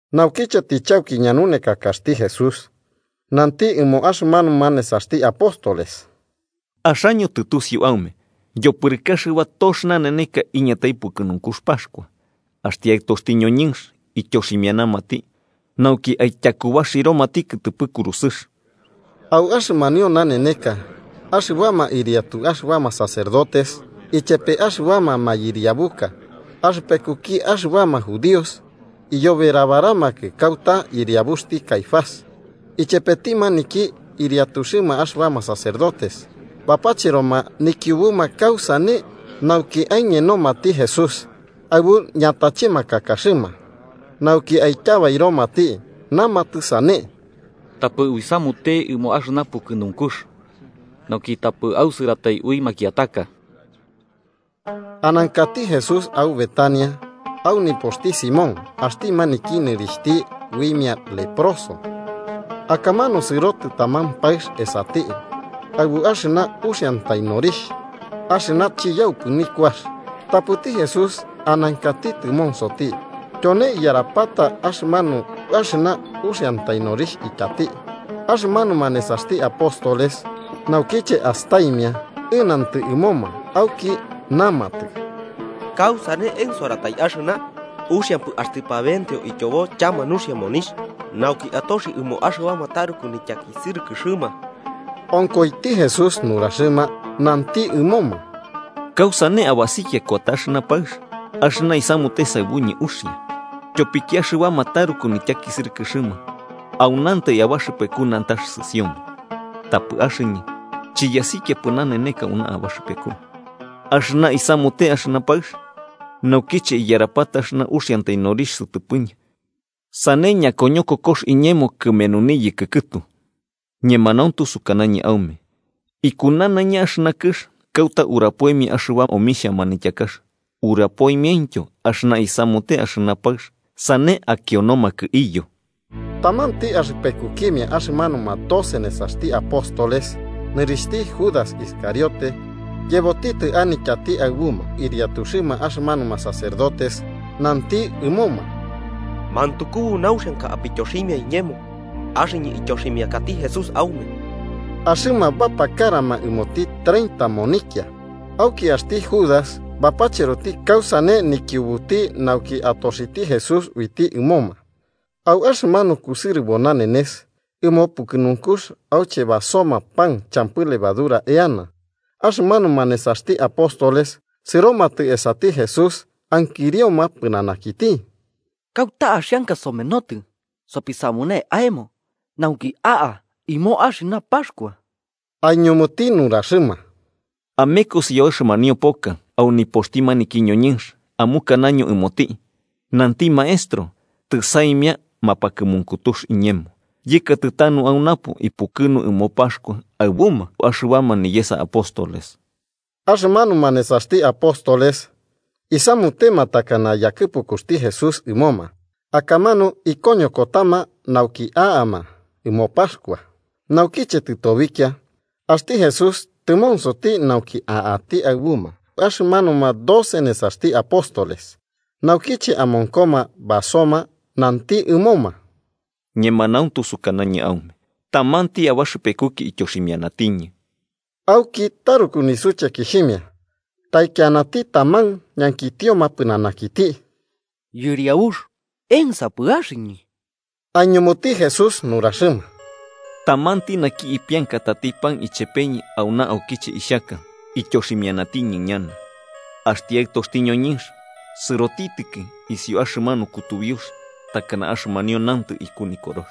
Naukiche tɨchauki ñanunekakaxti Jesús, nanti ɨmo axɨmanuma nesaxti apóstoles: 2–Axaño tɨtusiu aume, yopɨrɨkɨ axɨba tox naneneka iñatai pukɨnunkux Paxkua, axti Aɨtoxti ñoñɨnx ityoximianamati nauki aityakubaxiromati kɨtɨpɨ kurusɨx. Au axɨmanio naneneka axɨbama ɨriatu axɨbama sacerdotes ichepe axɨbama mayɨriabuka axɨpekuki axɨbama judíos iyoberabaramakɨ kauta yɨriabuxti Caifás, ichepeti maniki ɨriatuxɨma axɨbama sacerdotes, bapacheroma nikiubuma kausane nauki aiñenomati Jesús aɨbu ñatachemakakaxɨma, nauki aityabairomati. Namatɨ sane: –Tapɨ uisamute ɨmo axɨna pukɨnunkux, nauki tapɨ ausɨratai ui makiataka. Anankati Jesús au Betania, au nipoxti Simón, axti maniki nɨrixhti uimia leproso. Akamanu sɨrotɨ taman paɨx esati aɨbu axɨna uxiantai norixh axɨna chiyaupɨ nikuax. Tapɨti Jesús anankati tɨmonsoti, tyone iyarapata axɨmanu axɨna uxiantai norixh ityati. Axɨmanuma nesaxti apóstoles, naukiche astaimia, ɨnantɨ ɨmoma auki namatɨ: –¿Kausane ensoratai axɨna? Uxiampɨ axtɨ pabenteo ityobo chama nuxia monixh, nauki atoxi ɨmo axɨbama taruku nityakisɨrɨkɨrɨma. Onkoiti Jesús nuraxɨma, nanti ɨmoma: –¿Kausane abasikia kuata axɨna paɨx? Axɨna isamute saɨbuñɨ uxia. Tyopiki axɨbama taruku nityakisɨrɨkɨxɨma aunantai abaxɨpeku nantax sɨsioma, tapɨ axɨñɨ chiyasikiapɨ naneneka auna abaxɨpeku. Axɨna isamute axɨna paɨx, naukiche iyarapata axɨna uxiantai norixh sɨtɨpɨñɨ, sane ñakoñokokox iñemo kɨmenu niyɨkɨ kɨtu. Ñemanuntu sukanañɨ aume iku nanaiña axɨna kɨx kauta urapoimia axɨbama omixha manityakax, urapoimiaintyo axɨna isamute axɨna paɨx, sane akionomakɨ iyo. Tamanti axɨpekukimia axɨmanuma doce nesaxti apóstoles, nɨrixhti Judas Iscariote, yebotitɨ anityati aɨbuma ɨriatuxɨma axɨmanuma sacerdotes nanti ɨmoma: –¿Mantukubo nauxianka apityoximia iñemo, axɨñɨ ityoximiakati Jesús aume? Axɨma bapakarama ɨmoti treinta monikia. Auki axti Judas bapacheroti kausane nikiubuti nauki atoxiti Jesús uiti ɨmoma. Au axɨmanu kusɨrɨbo nanenes ɨmo pukɨnunkux auche basoma pan champɨ levadura eana, axɨmanuma nesaxti apóstoles sɨromatɨ esati Jesús ankirioma pɨnanakiti: –¿Kauta axianka somenotɨ sopisamune aemo nauki aka ɨmo axɨna Paxkua? Aiñumuti nuraxɨma: –Amekosi au axɨmanio poka, au nipoxti maniki ñoñɨnx, amukanaño ɨmoti: ‘Nanti Maestro: Tɨsaimia mapakɨmunkutux iñemo, yɨkatɨ tanu au napo ipukɨnu ɨmo Paxkua aɨbuma axɨbama niyesa apóstoles.’ Axɨmanuma nesaxti apóstoles isamutema takana yakɨpukuxti Jesús ɨmoma, akamanu ikoñokotama nauki a'ama ɨmo Paxkua. Naukiche tɨtobikia, axti Jesús tɨmonsoti nauki a'ati aɨbuma axɨmanuma doce nesaxti apóstoles. Naukiche amonkoma basoma, nanti ɨmoma: –Ñemanauntu sukanañɨ aume tamanti abaxɨpekuki ityoximianatiñɨ. Auki taruku nisuchekixhimia, taikianati taman ñankitioma pɨnanakiti: –Yɨriabux, ¿ensapɨ axɨñɨ? Aiñumuti Jesús nuraxɨma: –Tamanti naki ipiankatati pan ichepeñɨ auna aukiche ixhaka, ityoximianatiñɨ ñana. Axti Aɨtoxti ñoñɨnx sɨrotitɨki isiuki axɨmanu kutubiux takana axɨmanio nantɨ iku Nikorox.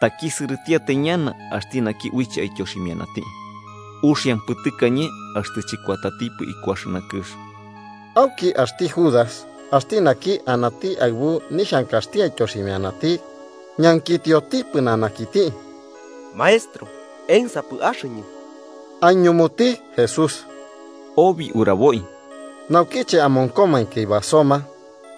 ¡Takisɨrɨtiatai ñana axti naki uiche aityoximianati! Uxiampɨ tɨkañe axtɨ chɨkuatatipɨ iku axɨna kɨx. Auki axti Judas, axti naki anati aɨbu nixhankaxti aityoximianati, ñankitioti pɨnanakiti: –Maestro, ¿ensapɨ axɨñɨ? –Aiñumuti Jesús–obi uraboi. Naukiche amonkomainki basoma,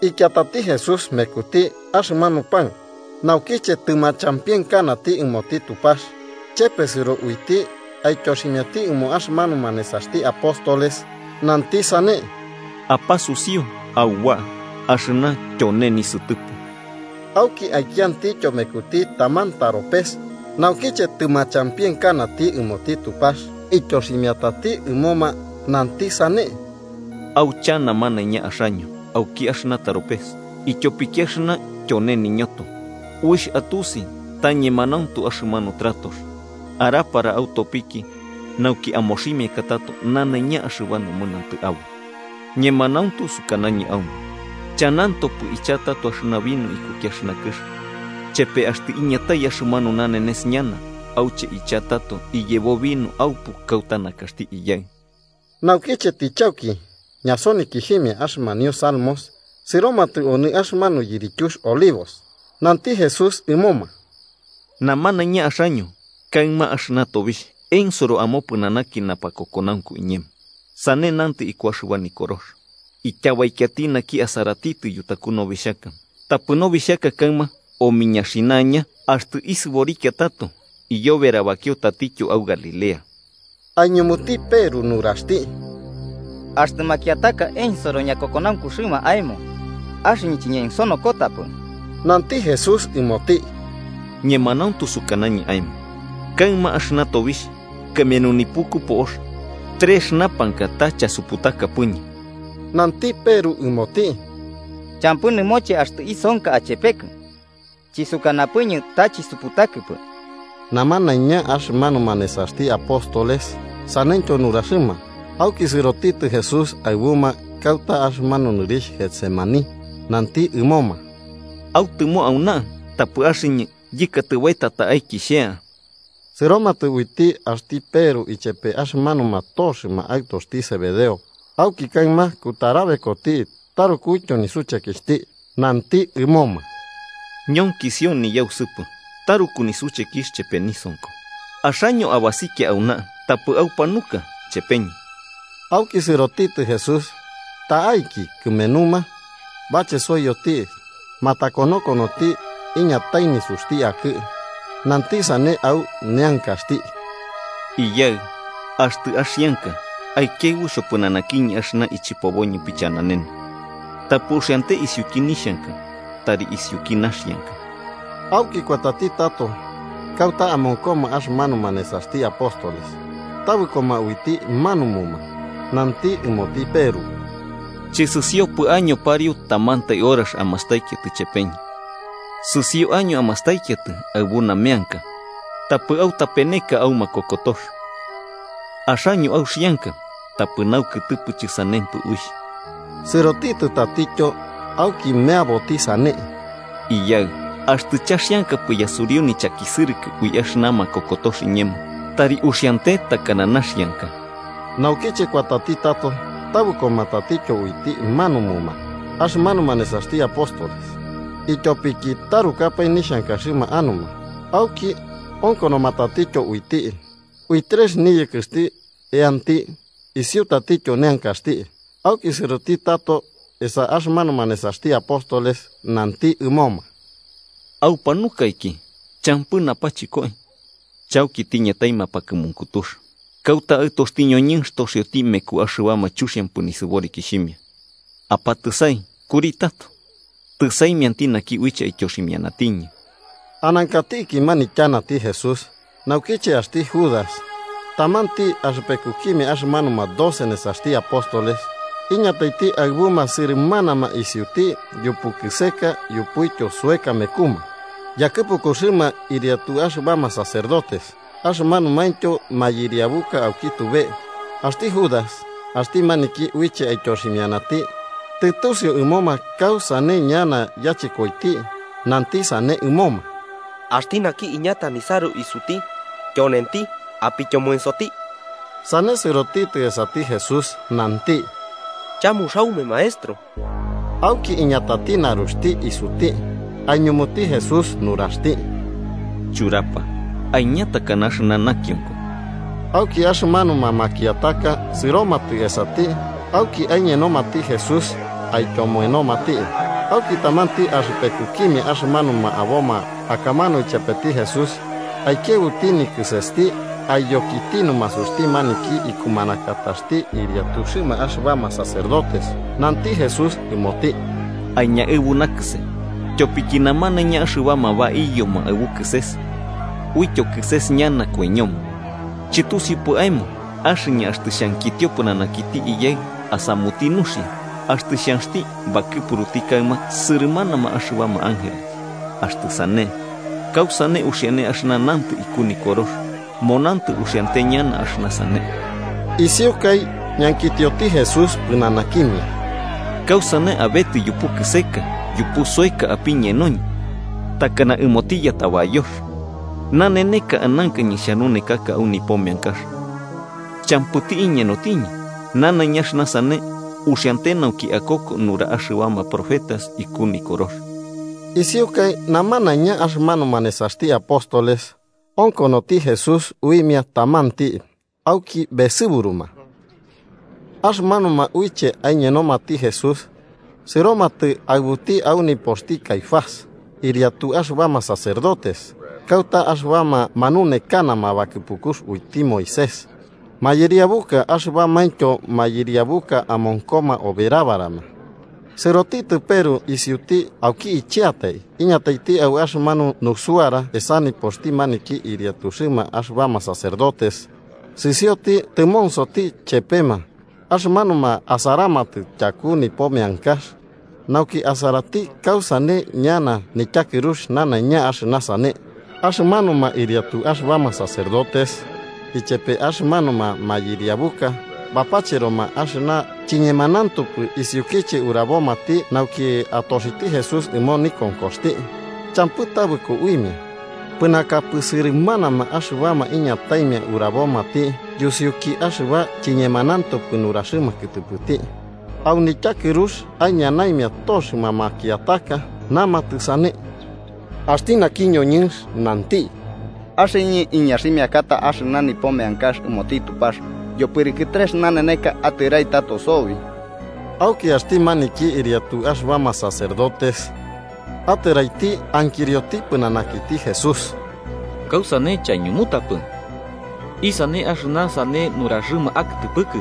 ikiatati Jesús mekuti axɨmanu pan, naukiche tɨmachampienkanati ɨmoti Tupax, chepesɨro uiti aityoximiati ɨmo axɨmanuma nesaxti apóstoles, nanti sane: –Apasusiu auba, axɨna tyone nisɨtɨpɨ. Auki aikiantityo mekuti taman taropes, naukiche tɨmachampienkanati ɨmoti Tupax, ityoximiatati ɨmoma, nanti sane: –Aucha namanaiña axaño auki axɨna taropes, ityopiki axɨna tyone niñoto, uixh atusi ta ñemanauntu axɨmanu tratox, arapara autopiki nauki amoximiaka tato nanaiña axɨba nomɨnantɨ aboi. Ñemanauntu sukanañɨ aume chanantopɨ icha tato axɨna vino ikuki kɨx, chepe axtɨ iñatai axɨmanu nanenes ñana auche icha tato iyebo vino aupu kauta nakaxti Iyaɨ. Naukiche tɨchauki ñasonikixhimia axɨmanio salmos, sɨromatɨ onɨ axɨmanu Yirityux Olivos. Nanti Jesús ɨmoma: –Namanaiña axaño kaɨma axɨna tobixh ensoro amopɨnanaki napakokonaunku iñemo. Sane nantɨ iku axɨba Nikorox: ‘Ityabaikiati naki asaratitɨ yutaku nobixhaka, tapɨ nobixhaka kaɨma omiñaxinaña.’ Axtɨ isɨborikia tato, iyoberabakio tatityo au Galilea. Aiñumuti Peru nuraxti: –Axtɨ makiataka ensoro ñakokonaunkuxɨma aemo, axɨñɨ chiñensonokotapɨ. Nanti Jesús ɨmoti: –Ñemanauntu sukanañɨ aemo kaɨma axɨna tobixh, kɨmenu nipuku po'ox, trex urapakai ta chasuputakapɨñɨ. Nanti Peru ɨmoti: –Champɨ nɨmoche axtɨ isonka achepekɨ, chisukanapɨñɨ ta chisuputakɨpɨ. Namanaiña axɨmanuma nesaxti apóstoles saneityo nuraxɨma. Auki sɨrotitɨ Jesús aɨbuma kauta axɨmanu nɨrixh Getsemaní, nanti ɨmoma: –Autɨmo auna, tapɨ axɨñɨ yɨkatɨ baeta ta'aiki xhea. Sɨromatɨ uiti axti Peru ichepe axɨmanuma toxɨma aɨtoxti Zebedeo, auki kaɨma kutarabekoti tarukuityo nisuchekixhti. Nanti ɨmoma: –Ñonkisio niyausɨpɨ taruku nisuchekixh chepe nisonko. Axaño abasikia auna, tapɨ aupanuka chepeñɨ. Auki sɨrotitɨ Jesús ta'aiki kɨmenuma, bachesoiyoti matakonokonoti iñatai nisuxti akɨ, nanti sane au neankaxti: “Iyaɨ, axtɨ axianka, aikiaɨbu xhopɨnanakiñɨ axɨna ichɨpoboñɨ pichananene. Tapɨ uxiante isiuki nixhanka, tari isiuki naxianka.” Auki kuatati tato kauta amonkoma axɨmanuma nesaxti apóstoles, tabɨkoma uiti manumuma. Nanti ɨmoti Peru: –¿Chɨsɨsiopɨ año pariu tamantai horax amastaikiatɨ ichepeñɨ? Sɨsio año amastaikiatɨ aɨbu nameanka, tapɨ autapeneka. Axaño auxianka, tapɨ naukɨtɨpɨ chɨsanempɨ uixh. Sɨrotitɨ tatityo, auki meaboti sane: “Iyaɨ, axtɨ chaxiankapɨ yasuriu nichakisɨrɨkɨ ui axɨna makokotox iñemo, tari uxiane takana naxianka.” Naukiche kuatati tato, tabɨkoma tatityo uiti manumuma axɨmanuma nesaxti apóstoles, ityopiki tarukapae nixhankaxɨma anuma. Auki onkonoma tatityo uiti, uixh trex niyɨkɨxti eanti, isiu tatityo neankaxti. Auki sɨrotɨ tato esa axɨmanuma nesaxti apóstoles, nanti ɨmoma: –¿Aupanukaiki champɨ napachɨkoi? Chauki tiñatai mapakɨmunkutux kauta axti Aɨtoxti ñoñɨnx toxioti mekuma axɨbama chuxiampɨ nisɨborikixhimia. Apatɨsai, kuri tato, tɨsaimianti naki uiche aityoximianatiñɨ. Anankatiki manityanati Jesús, naukiche axti Judas, tamanti axɨpekukimia axɨmanuma doce nesaxti apóstoles, iñataiti aɨbuma sɨrɨmanama isiuti yupu kɨseka yupuityo soeka mekuma. Yakɨpukuxɨma ɨriatu axɨbama sacerdotes, axɨmanumaintyo mayɨriabuka auki tube. Axti Judas, axti maniki uiche aityoximianati, tɨtusiu ɨmoma kausane ñana yachɨkoiti, nanti sane ɨmoma: “Axti naki iñata nisaru isuti, tyonenti. Apityomoensoti.” Sane, sɨrotitɨ esati Jesús, nanti: –¡Chamuxaume, Maestro! Auki iñatati naruxti isuti. Aiñumuti Jesús nuraxti: –Churapa, aiña takana axɨna nakionko. Auki axɨmanuma makiataka sɨromatɨ esati, auki aiñenomati Jesús aityomoenomati. Auki, tamanti axɨpekukimia axɨmanuma aboma akamanu ichepeti Jesús aikiaɨbuti nikɨsesti aiyokiti numasuxti maniki ikumanakataxti ɨriatuxɨma axɨbama sacerdotes. Nanti Jesús ɨmoti: –Aiñaɨbu nakɨse. Tyopiki namanaiña axɨbama baiyoma aɨbu kɨses, uityo kɨses ñana koiñoma. ¿Chɨtusiupɨ aemo axɨñɨ axtɨ xhankitio pɨnanakiti Iyaɨ asamuti nuxia, axtɨ xhanxti bakɨpuruti kaɨma sɨrɨmanama axɨbama ángeles? Axtɨ sane, ¿kausane uxiane axɨna nantɨ iku Nikorox, monantɨ uxiante ñana axɨna sane? Isiukai ñankitioti Jesús pɨnanakimia: –¿Kausane abetɨ yupu kɨseka yupu soeka apiñenoñɨ, takanati yatabayox? Naneneka anankañɨ xhanunekaka au nipo meankax, champɨti iñenotiñɨ. Nanaiña axɨna sane uxiante nauki akoko nura axɨbama profetas iku Nikorox. Isiukai, namanaiña axɨmanuma nesaxti apóstoles onkonoti Jesús uimia tamanti auki besɨburuma. Axɨmanuma uiche aiñenomati Jesús sɨromatɨ aɨbuti au nipoxti Caifás, ɨriatu axɨbama sacerdotes, kauta axɨbama manunekanama bakɨpukux uiti Moisés mayɨriabuka axɨbamaintyo mayɨriabuka amonkoma oberabarama. Sɨrotitɨ Peru isiuti auki icheatai iñataiti au axɨmanu nusuara esa nipoxti maniki ɨriatuxɨma axɨbama sacerdotes, sɨsioti tɨmonsoti chepema axɨmanuma asaramatɨ tyaku nipo meankax, nauki asaraiti kausane ñana nityakɨrux nanaiña axɨna sane. Axɨmanuma ɨriatu axɨbama sacerdotes ichepe axɨmanuma mayɨriabuka bapacheroma axɨna chiñemanauntupɨ isiukiche urabomati nauki atoxiti Jesús ɨmo nikonkoxti, champɨ tabɨko uimia, pɨnakapɨ sɨrɨmanama axɨbama iñataimia urabomati yusiuki axɨba chiñemanauntupɨ nuraxɨma kɨtɨpɨti. Au nityakɨrux aiñanaimia toxɨma makiataka, namatɨ sane: –Axti naki ñoñɨnx nanti: ‘Axɨñɨ iñaximiakata axɨna nipo meankax ɨmoti Tupax yopɨrɨkɨ trex naneneka atɨrai tato sobi.’ Auki axti maniki ɨriatu axɨbama sacerdotes atɨraiti ankirioti pɨnanakiti Jesús: –¿Kausane chaiñumutapɨ? ¿Isane axɨna sane nuraxɨma akɨtɨpɨkɨ?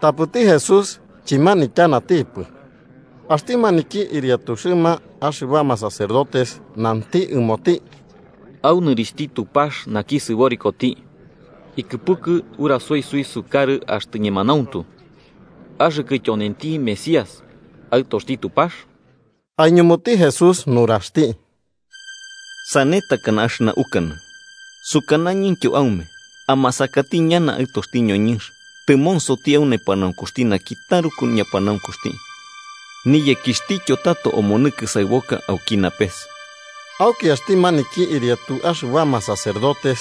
Tapɨti Jesús chɨmanityanatipɨ. Axti maniki ɨriatuxɨma axɨbama sacerdotes nanti ɨmoti: –Au nɨrixhti Tupax naki sɨborikoti ikɨpukɨ urasoi suisukarɨ axtɨ ñemanauntu. Axɨkɨ tyonenti Mesías, Aɨtoxti Tupax. Aiñumuti Jesús nuraxti: –Sane takana axɨna ukanɨ. Sukanañɨntyo aume amasakati ñana Aɨtoxti ñoñɨnx tɨmonsoti au nepanaunkuxti naki taruku ñapanaunkuxti, niyekixhtityo tato omonɨ kɨsaɨboka auki napes. Auki axti maniki ɨriatu axɨbama sacerdotes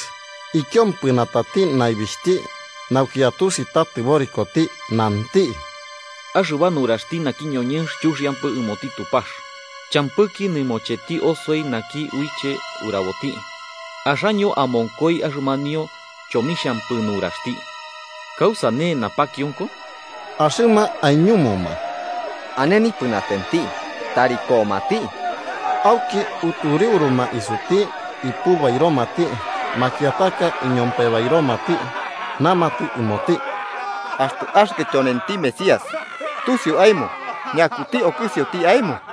ikiompɨnatati naibixhti nauki atusi ta tɨborikoti, nanti: –¡Axɨba nuraxti naki ñoñɨnx chuxiampɨ ɨmoti Tupax! ¿Champɨki nɨmocheti osoi naki uiche uraboti? Axaño amonkoi axɨmanio chomixhampɨ nuraxti. ¿Kausane napakionko? Axɨma aiñumuma: –Ane nipɨnatenti, tari akonti. Auki utureuruma isuti ipubairomati. Makiataka iñompebairomati, namatɨ ɨmoti: –Axtɨ axɨkɨ tyonenti Mesías, ¡tusiu aemo ñakiti okɨsioti aemo!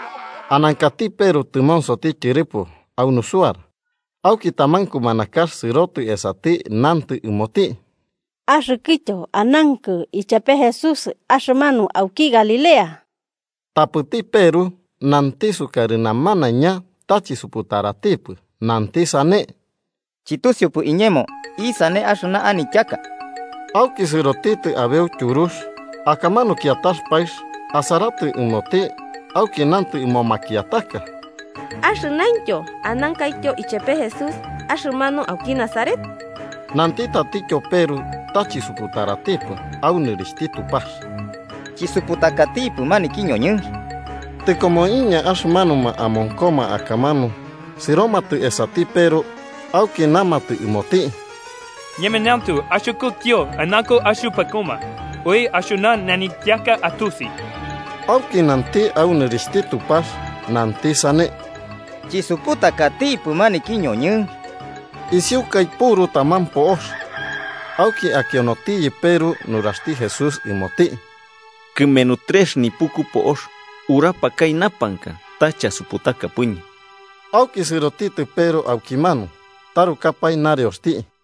Anankati Peru tɨmonsoti tyɨrɨpo, au nusuara. Auki, taman kumanakax sɨrotɨ esati nantɨ ɨmoti: –Axɨkɨtyo anankɨ ichepe Jesús, axɨmanu auki Galilea. Tapɨti Peru nanti sukarɨ namanaiña ta chisuputaratipɨ, nanti sane: –Chɨtusiupɨ iñemo isane axɨna anityaka. Auki sɨrotitɨ abeu tyurux, akamanu kiatax paɨx asaratɨ ɨmoti auki nantɨ ɨmo makiataka: –Axɨmanu anankaityo ichepe Jesús, axɨmanu auki Nazaret. Nanti tatityo Peru ta chisuputaratipɨ, au nɨrixhti Tupax: –¡Chisupatakatipɨ maniki ñoñɨnx! Tɨkomoiña, axɨmanuma amonkoma akamanu sɨromatɨ esati Peru auki namatɨ ɨmoti: –Ñemanauntu axɨkɨtyo anankɨ axɨpekuma. Ui axɨna nanityaka atusi. Auki nanti au nɨrixhti Tupax, nanti sane: –¡Chisuputakatipɨ maniki ñoñɨnx! Isiukai puru taman po'ox, auki akionotiyɨ Peru nuraxti Jesús ɨmoti: “Kɨmenu trex nipuku po'ox urapakai chasuputakapɨñɨ.” Auki sɨrotitɨ Peru aukimanu, tarukapae nareoxti.